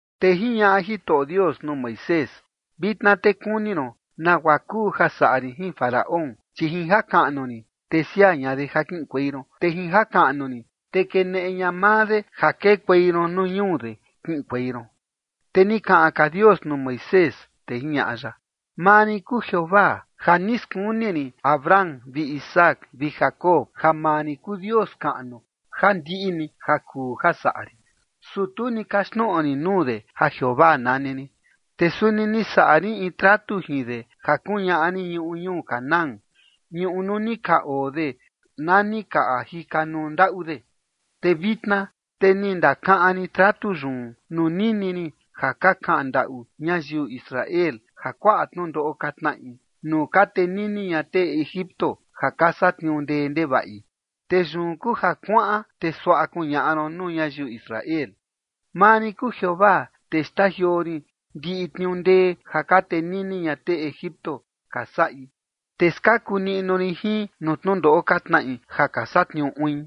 Te jiñaꞌa Jitoꞌo Dios nuu Moisés: ―Vitna te kuni ron nagua kuu ja saꞌa rin jin Faraón, chi jin jakaꞌnu rin, te siaa ña de ja kiꞌinkuei ron, te jin jakaꞌnu rin te keneꞌe ña maa de ja kekuei ron nuu ñuu de kiꞌinkuei ron. Te ni kaꞌan ka Dios nuu Moisés, te jiñaꞌa ya: ―Maa rin kuu Jeovaa. Ja ni skuni rin Abraham vi Isaac vi Jacob ja maa rin kuu Dios kaꞌnu ja ndiꞌi ni ja kuu ja saꞌa rin, su tu ni kaxtnoꞌo rin nuu de ja Jeovaa nani rin. Te suni ni saꞌa rin in tratu jin de ja kuñaꞌa rin ñuꞌu ñuu Canaán, ñuꞌu nuu ni ka oo de na ni ka jikanuu ndaꞌu de. Te vitna te ni ndakaꞌan rin tratu yun nuu nini rin ja ka kaꞌan ndaꞌu ñayiu Israel ja kuaꞌa tnundoꞌo ka tnaꞌi nuu ka tenini ña tee Egipto ja ka satniuu ndee ndevaꞌi. Te yun kuu ja kuaꞌan, te suaꞌa kuñaꞌa ron nuu ñayiu Israel: “Maa rin kuu Jeovaa, te xtajioo rin ndiꞌi tniuu ndee ja ka tenini ña tee Egipto ka saꞌi, te skaku niꞌnu rin jin nuu tnundoꞌo ka tnaꞌi ja ka satniuu uin.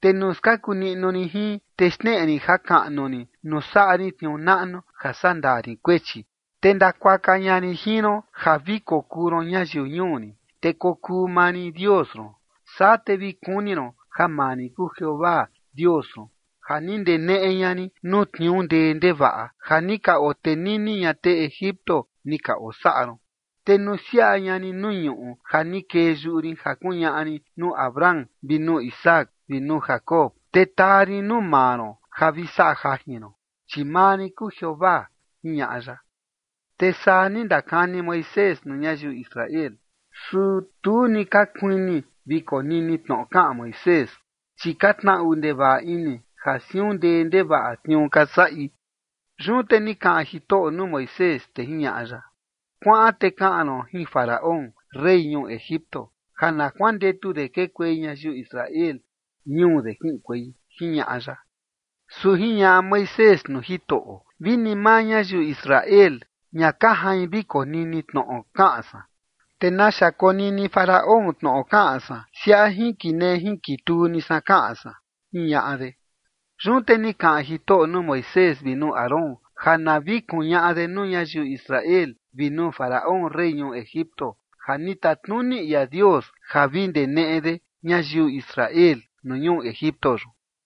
Te nuu skaku niꞌnu rin jin, te xneꞌe rin jakaꞌnu rin nuu saꞌa rin tniuu naꞌnu ja sandaa rin kuechi. Te ndakuaka ña rin jin ron, ja vi kokuu ron ñayiu ñuu rin, te kokuu maa rin Dios ron. Saa te vi kuni ron ja maa rin kuu Jeovaa Dios ron ja ni ndeneꞌe ña rin nuu tniuu ndee ndevaꞌa ja ni ka otenini ña tee Egipto ni ka osaꞌa ron. Te nusiaꞌa ña rin nuu ñuꞌu ja ni kee yuꞌu rin ja kuñaꞌa rin nuu Abraham vi nuu Isaac vi nuu Jacob, te taa rin nuu maa ron ja vi saꞌa jajin ron. Chi maa rin kuu Jeovaa” ―jiñaꞌa ya. Te saa ni ndakani Moisés nuu ñayiu Israel, su tu ni ka kuini vi konini tnoꞌo kaꞌan Moisés, chi ka tnaꞌu ndevaꞌa ini ja siun ndee ndevaꞌa tniuu ka saꞌi. Yun te ni kaꞌan Jitoꞌo nuu Moisés, te jiñaꞌa ya: Kuaꞌan te kaꞌan ron jin Faraón, rey ñuu Egipto, ja na kuandetu de kekuei ñayiu Israel ñuu de kiꞌinkuei ―jiñaꞌa ya. Su jiñaꞌa Moisés nuu Jitoꞌo: ―Vi ni maa ñayiu Israel ña ka jain vi konini tnoꞌo kaꞌan san, ¿te naxa konini Faraón tnoꞌo kaꞌan san siaꞌa jinkinee jinkituu ni san kaꞌan san? ―jiñaꞌa de. Yun te ni kaꞌan Jitoꞌo nuu Moisés vi nuu Aarón ja na vi kuñaꞌa de nuu ñayiu Israel vi nuu Faraón, rey ñuu Egipto, ja ni tatnuni ia Dios ja vi ndeneꞌe de ñayiu Israel nuu ñuu Egipto yun.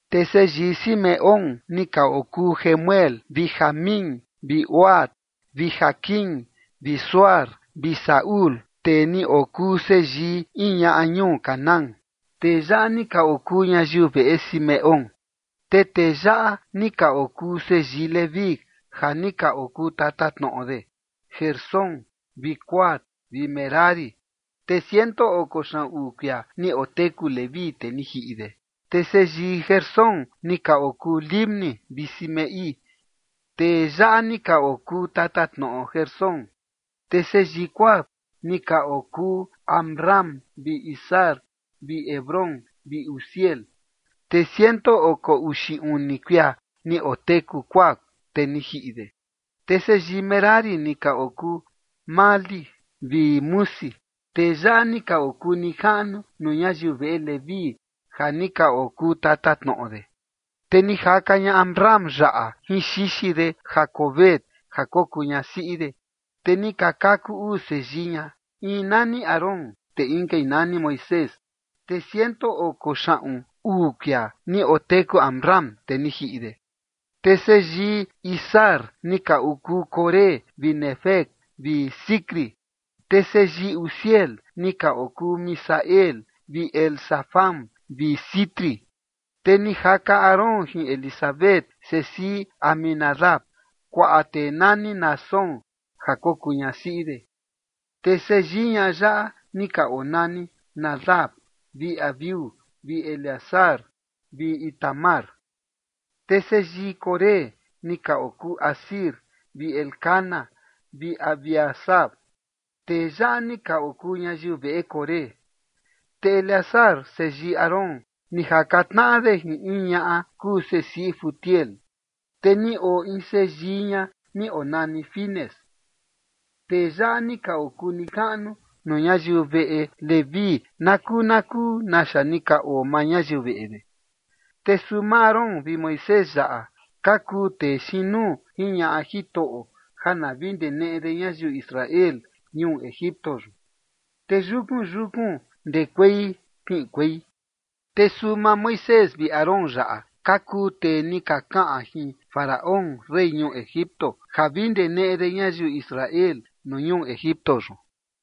Te seyii Simeón ni ka okuu Jemuel vi Jamín vi Ohad vi Jaquín vi Zohar vi Saúl, tee ni okuu seyii in ñaꞌa ñuu Canaán. Tee yaꞌa ni ka okuu ñayiu veꞌe Simeón. Te tee yaꞌa ni ka okuu seyii Leví ja ni ka okuu tatatnoꞌo de: Gersón vi Coat vi Merari. Te ciento oko xaꞌun uu kuia ni oteku Leví, te ni jiꞌi de. Te seyii Gersón ni ka okuu Libni vi Simei. Tee yaꞌa ni ka okuu tatatnoꞌo Gersón. Te seyii Coat ni ka okuu Amram vi Izhar vi Hebrón vi Uziel. Te ciento oko uxi uni kuia ni oteku Coat, te ni jiꞌi de. Te seyii Merari ni ka okuu Mahli vi Musi. Tee yaꞌa ni ka okuu nijaꞌnu nuu ñayiu veꞌe Leví ja ni ka okuu tatatnoꞌo de. Te ni jaka ña Amram yaꞌa jin xixi de Jocabed ja kokuu ñasiꞌi de, te ni ka kaku uu seyii ña, in nani Aarón, te inkai nani Moisés. Te ciento oko xaꞌun uu kuia ni oteku Amram, te ni jiꞌi de. Te seyii Izhar ni ka okuu Coré vi Nefeg vi Zicri. Te seyii Uziel ni ka okuu Misael vi Elzafán vi Sitri. Te ni jaka Aarón jin Elisabet sesiꞌi Aminadab, kuaꞌa tee nani Naasón ja kokuu ñasiꞌi de. Te seyii ñaꞌa yaꞌa ni ka onani Nadab vi Abiú vi Eleazar vi Itamar. Te seyii Coré ni ka okuu Asir vi Elcana vi Abiasaf. Tee yaꞌa ni ka okuu ñayiu veꞌe Coré. Te Eleazar, seyii Aarón, ni jaka tnaꞌa de jin in ñaꞌa kuu sesiꞌi Futiel, te ni oo in seyii ña ni onani Finees. Tee yaꞌa ni ka okuu nijaꞌnu nuu ñayiu veꞌe Leví nakuu nakuu naxa ni ka oo maa ñayiu veꞌe de. Te suu maa Aarón vi Moisés yaꞌa ka kuu tee xiin nuu jiñaꞌa Jitoꞌo ja na vi ndeneꞌe de ñayiu Israel ñuu Egipto yun, te yukun yukun ndekuei kiꞌinkuei. Te suu maa Moisés vi Aarón yaꞌa ka kuu tee ni ka kaꞌan jin Faraón, rey ñuu Egipto, ja vi ndeneꞌe de ñayiu Israel nuu ñuu Egipto yun.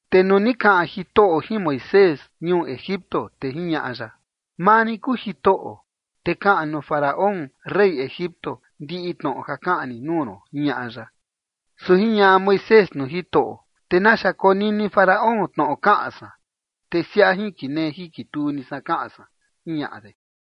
Te nuu ni kaꞌan Jitoꞌo jin Moisés ñuu Egipto, te jiñaꞌa ya: ―Maa rin kuu Jitoꞌo, te kaꞌan nuu Faraón, rey Egipto, ndiꞌi tnoꞌo ja kaꞌan rin nuu ron ―jiñaꞌa ya. Su jiñaꞌa Moisés nuu Jitoꞌo: ―¿Te naxa konini Faraón tnoꞌo kaꞌan san, te siaꞌa jinkinee jinkituu ni san kaꞌan san? ―jiñaꞌa de.